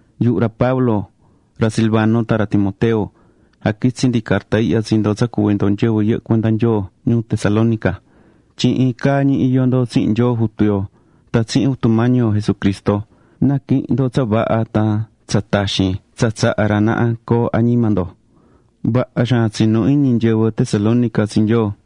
Yuhu ra Pablo ra Silvano tan ra Timoteo, jaquitsí ndi carta ihya tsi ndo tsa cuví ndo nyɨvɨ yɨhɨ́ cuenda Nyoo ñuu Tesalónica. Tyin iin caa ñi iyó ndo tsihin Nyoo Jutu yo tan tsihin Jutu Mañi yo Jesucristo. Na̱quihin ndo tsa vaha tan tsa taxin tsa tsahá ra naha coo añima ndo.Vaha xaan tsinú iñi nyɨvɨ Tesalónica tsi Nyoo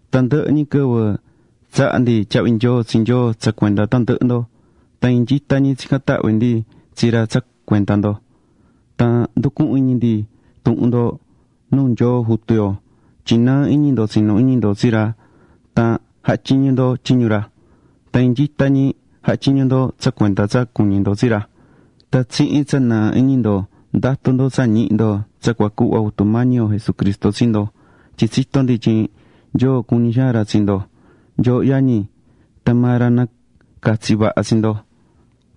Tandɨhɨ ñi quɨvɨ tsahá ndi tyahvi nyoo tsi Nyoo tsa cuenda tandɨhɨ ndo. Tan iin nyita ñi tsicán tahvi ndi tsi ra tsa cuenda ndo. Tan nducuhún iñi ndi tuhun ndo nuu Nyoo Jutu yo tyin nɨɨ iñi ndo tsinú iñi ndo tsi ra tan jahá tyiñu ndo tyiñu ra. Tan iin nyita ñi jahá tyiñu ndo tsa cuenda tsa cuñí ndo tsi ra. Tan tsihin tsa nɨɨ iñi ndo ndatú ndo tsa ñihi ndo tsa cua cuhva Jutu Mañi yo Jesucristo tsi ndo. Tyin tsitó ndi tyin Nyoo cuñí xaan ra tsi ndo, nyooho yañi, tan maa ra nacatsi̱ vaha tsi ndo.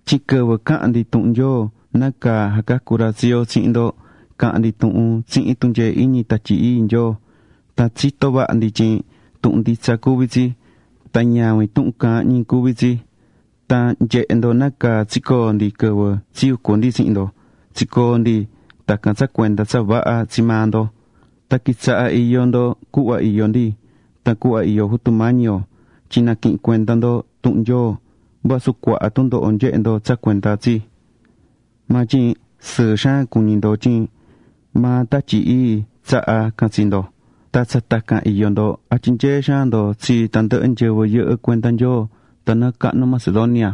Tyin quɨvɨ caha̱n ndi tuhun Nyoo, nácaa jacacú ra tsi yo, tsihin ndo, caha̱n ndi tuhun tsihin tunyee iñi Tatyi Ii Nyoo, tan tsitó vaha ndi tyin tuhun nditsa cuví tsi. Tan ñavin tuhun caahán ñi cuví tsi. Tan nyehe̱ ndo nácaa tsicoo̱ ndi quɨvɨ tsiyucu̱ ndi tsihin ndo. Tsicoo̱ ndi tacan tsa cuenda tsa vaha tsi maa ndo. Tan quitsaha̱ iyó ndo cuhva iyó ndi, tan cuhva iyó Jutu Mañi yo. Tyin naquihi̱n cuenda ndo tuhun Nyoo, vasu cuaha tundoho nyehe̱ ndo tsa cuenda tsi. Maa tyin sɨɨ xaan cuñí ndo tyin maa Tatyi Ii tsahá can tsi ndo. Tan tsa tacan iyó ndo, jatyinyeé xaan ndo tsi tandɨhɨ nyɨvɨ yɨhɨ́ cuenda Nyoo tanɨɨ cahnu Macedonia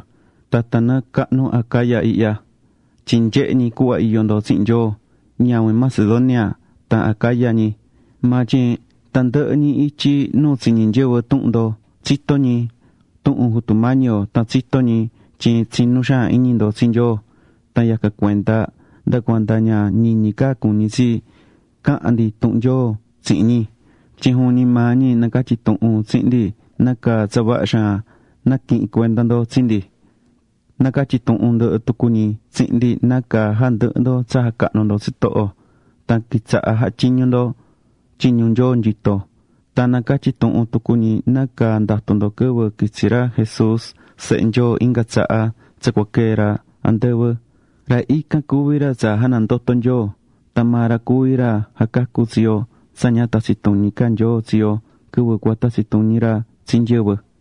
tan tanɨɨ cahnu Acaya ihya, tyin nyehé ñi cuhva iyó ndo tsihin Nyoo. Ñavin Macedonia tan Acaya ñi, maa tyin tandɨhɨ ñi ityi nu tsiñí nyɨvɨ tuhun ndo tsitó ñi tuhun Jutu Mañi yo tan tsitó ñi tyin tsinú xaan iñi ndo tsi Nyoo. Tan yacan cuenda nda cuanda ña ñiñi ca cuñí tsi cahan ndi tuhun Nyoo tsihin ñi. Tyin juvin ñi maa ñi nacatyí tuhun tsihin ndi nácaa tsa vaha xaan naquihi̱n cuenda ndo tsi ndi. Nacatyí tuhun ndɨhɨ tucu ñi tsihin ndi nácaa jandɨhɨ̱ ndo tsa jacahnú ndo tsitoho tan quitsaha̱ jahá tyiñu ndo tyiñu Nyoo nyito. Tan nacatyí tuhun tucu ñi nácaa ndatú ndo quɨvɨ quitsi ra Jesús Sehe Nyoo inga tsaha tsa cua quee ra andɨvɨ. Ra ican cuví ra tsa janandoto̱ Nyoo. Tan maa ra cuví ra jacacú tsi yo tsa ña tatsi tuñi ca Nyoo tsi yo quɨvɨ cua tatsi tuñi ra tsi nyɨvɨ.